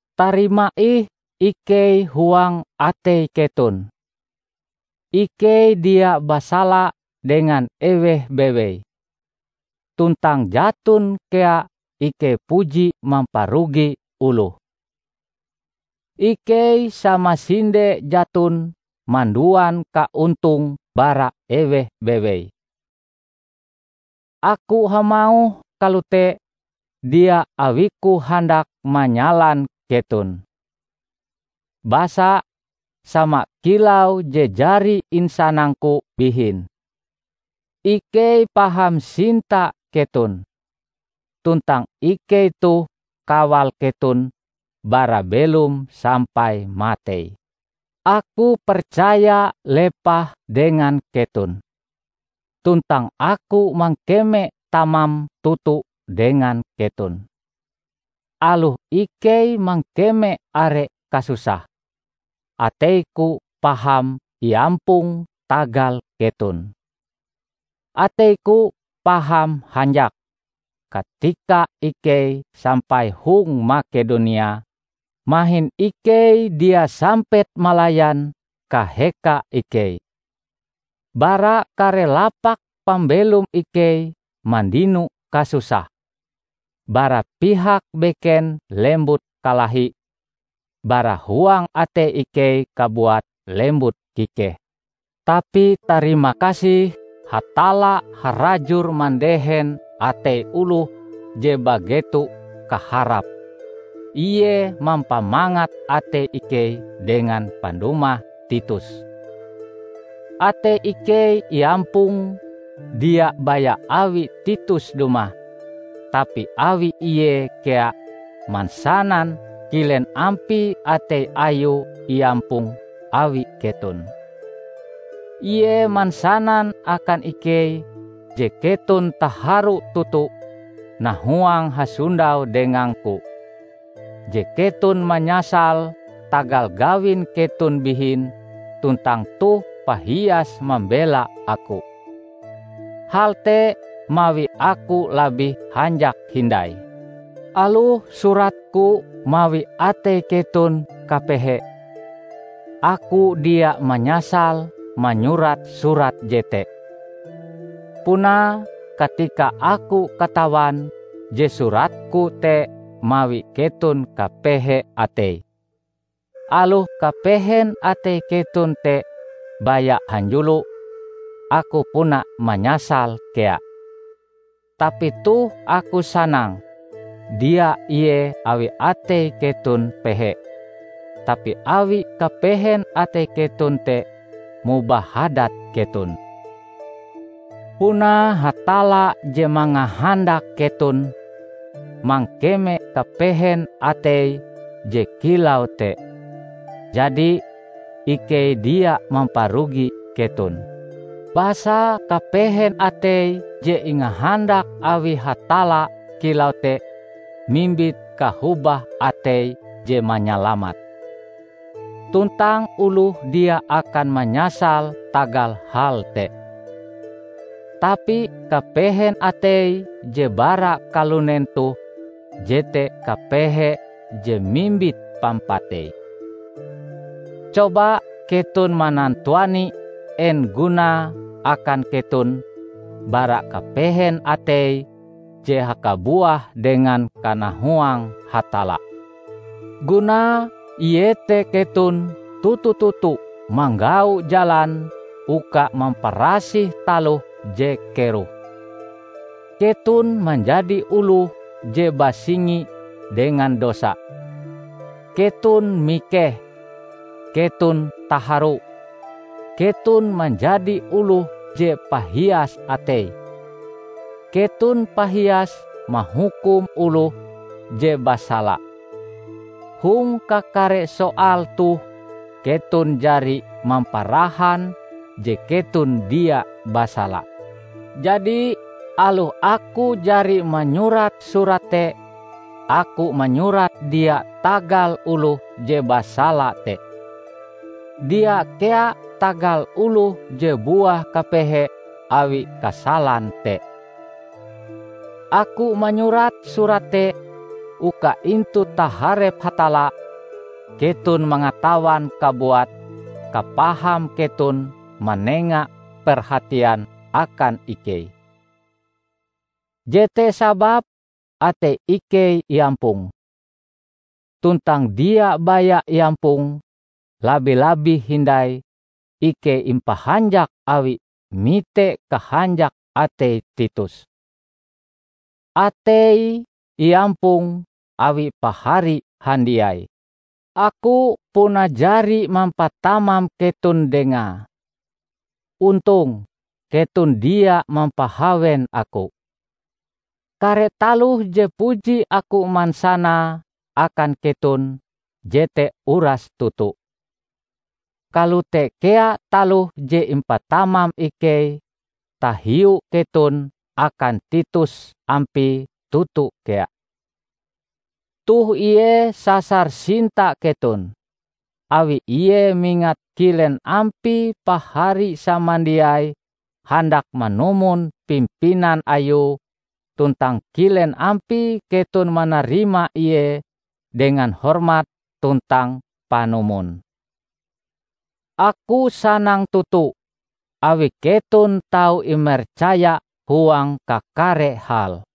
Tarima ih ikei huang atei keton. Ikei dia basala dengan eweh bewei, tuntang jaton kea ikei puji mamparugi oloh. Ikei samasinde jaton manduan kaontong bara eweh bewei. Aku hamauh kalote dia awiku handak manyalan keton. Basa, sama kilau je jari insanangku bihin, ikei paham sinta keton, tuntang ikei toh kawal keton bara belom sampai matei. Aku percaya lepah dengan keton. Tuntang aku mangkeme tamam toto dengan keton! Aloh ikei mangkeme are kasusah, ateiku paham iampong tagal keton. Ateiku paham hanjak! Katika ikei sampai hong Makedonia, mahin ikei dia sampet malayan kaheka ikei. Bara kare lapak pambelom ikei mandino kasusah; bara pihak beken lembut kalahi, bara huang atei ikei kabuat lembut kikeh. Tapi tarimakasih, Hatalla harajur mandehen atei oloh je bageto kaharap; ie mampamangat atei ikei dengan pandumah Titus. Atei ikei iampong dia baya awi Titus dumah, tapi awi ie kea mansanan kilen ampie atei ayue iampong awi keton. Ie mansanan akan ikei je keton taharu toto nahuang hasondau dengangku; je keton manyasal tagal gawin keton bihin tuntang toh pahias mambela aku. Hal te mawi aku labih hanjak hindai. Aloh suratku mawi atei keton kapehe, aku dia manyasal manyurat surat jete. Punae, katika aku katawan je suratku te mawi keton kapehe atei -- aloh kapehen atei keton te baya hanjulo -- aku puna manyasal kea. Tapi toh aku sanang -- dia ie awi atei keton pehe, tapi awi kapehen atei keton te mobah hadat keton. Puna Hatalla je mangahandak keton mangkeme kapehen atei je kilau te. Jadi, ikei dia mamparugi keton. Basa kapehen atei je ingahandak awi Hatalla kilau te mimbit kahobah atei je manyalamat. Tuntang oloh dia akan manyasal tagal hal te. Tapi kapehen atei je bara kalunen toh jete kapehe je mimbit pampatei. Coba keton manantuani en gunae akan keton bara kapehen atei je hakabuah dengan kanahuang Hatalla! Gunae iete keton toto-toto manggau jalan uka mamparasih taloh je keroh! Keton manjadi oloh je basingi dengan dosa, keton mikeh, keton taharu, keton manjadi oloh je pahias atei, keton pahias mahukum oloh je basala! Hong kakare soal toh keton jari mamparahan je keton dia basala. Jadi, aloh aku jari manyurat surat te, aku manyurat dia tagal oloh je basala te. Dia kea tagal oloh je buah kapehe awi kasalan te. Aku manyurat surat te uka intu taharep Hatalla, keton mangatawan kabuat kapaham keton manenga perhatian akan ikei. Jete sababe atei ikei iampong. Tuntang dia baya iampong, labi-labih hindai ikei impahanjak awi mite kahanjak atei Titus; ateie iampong awi pahari handiai. Aku puna jari mampatamam keton dengae. Ontong, keton dia mampahawen aku. Kare taloh je puji aku mansanae akan keton jete uras toto. Kalote kea taloh je impatamam ikei tahiu keton akan Titus ampie toto kea. Toh ie sasar sinta keton, awi ie mingat kilen ampie pahari samandiai handak manumon pimpinan ayue tuntang kilen ampie keton manarima ie dengan hormat tuntang panumon. Aku sanang toto, awi keton tau imercaya huang kakare hal.